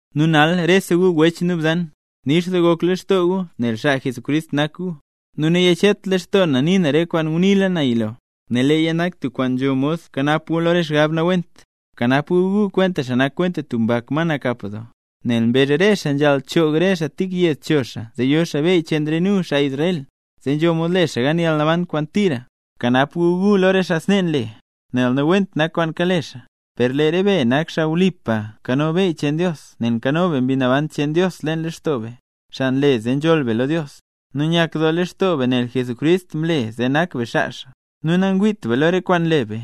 Nu nal rese gu wech nu bzan, nix doo gok lextoo gu nel xaa Jesucrist nak gu. Nu nanyachet lextoo na nii na re kwaan nguniila na yilo, nel leeya nak tub kwaan nzho mod kanap gu lo re xgab nawent. Bkanap gu gu lo re xaa nak kwenta tub mbak ma nakap doo, nel mbezh re xaa nzhaal choog re xaa tik yed cho xaa zee yo xaa beyy cheen re nu, xaa Israel, zee nzho mod le xaa gan yalnaban kwaan tira. Bkanap gu gu lo re xaa snee nle, nel nawent nak kwaan kale xaa. Per lee re be nak xaa wlipa nkano beyy cheen Dios nel nzho Mbi Naban cheen Dios leen lextoo be, xaa nle zee nzholl be lo Dios; nu nyak doo lextoo be nel Jesucrist mle zee nak be xaa xaa. Nu nangwiit be lo re kwaan nle be,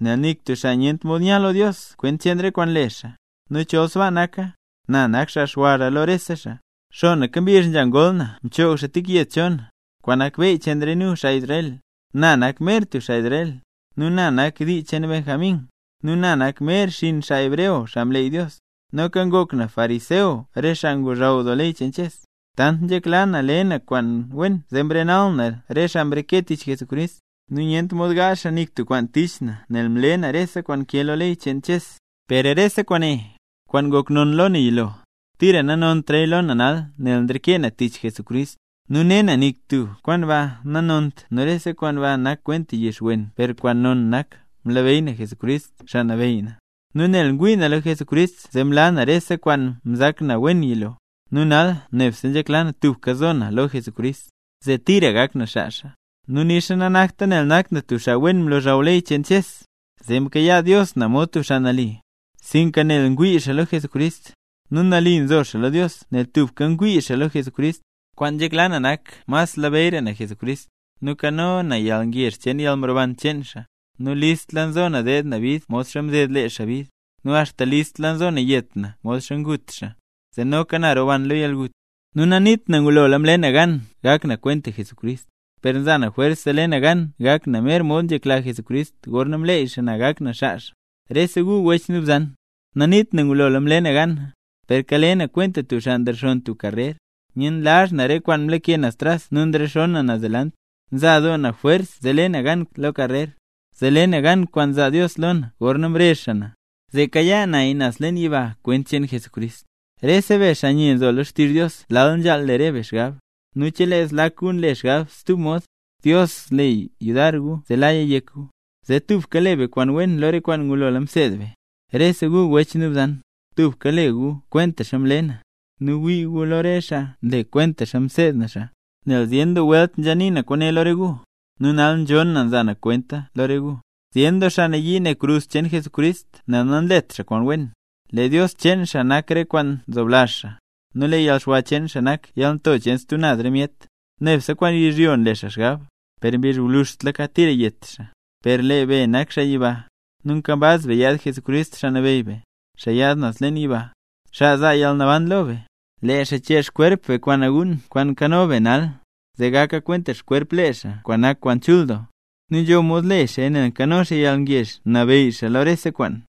nel nik tub xaa nyent mod nya lo Dios kwent cheen re kwaan nle xaa. Nu chol sbaa naka, ¡na nak xaa xwara lo rese xaa! Xonaka mbizh nzha ngol na mchoog xaa tik yed cho na, kwaan nak beyy cheen re nu, xaa Israel; na nak mer tub xaa Israel; nu na nak dii cheen Benjamín; nu na nak mer xinn xaa hebreo xaa mleey Dios; noka ngok na fariseo, xaa ngozhaw doo ley cheen Ches. Tant nzhekla na le na kwaan wen zee mrenal na re xaa mreke tich Jesucrist, nu nyent mod gaazh xaa nik tub kwaan tich na nel mle na rese kwaan nkee lo ley cheen Ches. Per rese kwaane, kwaan ngok non lo na yilo, tira nanontra lo na nal nel nreke na tich Jesucrist. Nu ne na nik tub kwaan ba nanont nu rese kwaan ba nak kwenta yix wen per kwaan nonra nak mlabeyy na Jesucrist Xaa Nabeyy na, nu nel ngwii na lo Jesucrist zee mlaa na rese kwaan mzak na wen yilo. Nu nal nebse nzhekla na tubka zo na lo Jesucrist, zee tira gak na xaa xaa. Nu nixa nanakta nel nak na tub xaa wen mlozhaw ley cheen Ches, zee mkayaa Dios na mod tub xaa nali, sinka nel ngwii na lo Jesucrist. Nu nali nzo xaa lo Dios nel tubka ngwii xaa lo Jesucrist. Kwaan nzhekla na nak mas labeyyra na Jesucrist, nu kano na yalngezh cheen yalnroban cheen xaa. Nu listla nzo na deed na bid modxa mded lee xaa bid, nu axta listla nzo na yet na modxa ngut xaa, zee noka na roban lo yalgut. Nu naniit na ngulola mle na gan gak na kwenta Jesucrist; per nza na jwers zee le na gan gak na mer mod nzhekla Jesucrist gorna mleey xaa na gak na xaa xaa. Rese gu wech nu bzan, naniit na ngulola mle na gana; per kale na kwenta tub xaa nrexonn tub karrer, nyenlazh na re kwaan mlake naz tras nu nzhexoon na naz delant. Nza doo na jwers zee le na gan karrer, zee le na gan kwaan zaa Dios lo na gorna mbezh xaa na, zee kayaa naya naz leen yiba kwent cheen Jesucrist. Rese be xaa nye nzo lo xtizh Dios lal nzhaal le re be xgab; nu chelee zlak gu nle xgab stub mod, Dios zle yudar gu zee laya yek gu. Zee tubka le be kwaan wen lo re kwaan ngulola mseed be. Rese gu wech nu bzan, tubka le gu kwentaxa mle na, nu wii gu lo re xaa nle kwentaxa mseed na xaa. Nel zyen doo welt nzha nii na kwaane lo re gu, nu nal nzhon na nza na kwenta lo re gu, zyen doo xaa nayii ne krus cheen Jesucrist nel nanlet xaa kwaan wen. Lee dios cheen xaa nak re kwaan nzoblazh xaa, nu lee yalxwa cheen xaa nak yalnto cheen stub naz re myet, nebse kwaan yizhyo nle xaa xgab. Per mbizh gwluzhtlaka tira yet xaa. Per lee be nak xaa yiba, nu nkambaz be yaad Jesucrist Xaa Nabeyy be, xaa yaad naz leen yiba, xaa zaa yalnaban lo be. Lee xaa chee xkwerp be kwaan naguun kwaan nkano be nal, zee gaka kwenta xkwerp lee xaa kwaan nak kwaan chul doo. Nu nzho mod le xaaya nel kano xaa yalngezh nabeyy xaa lo rese kwaan.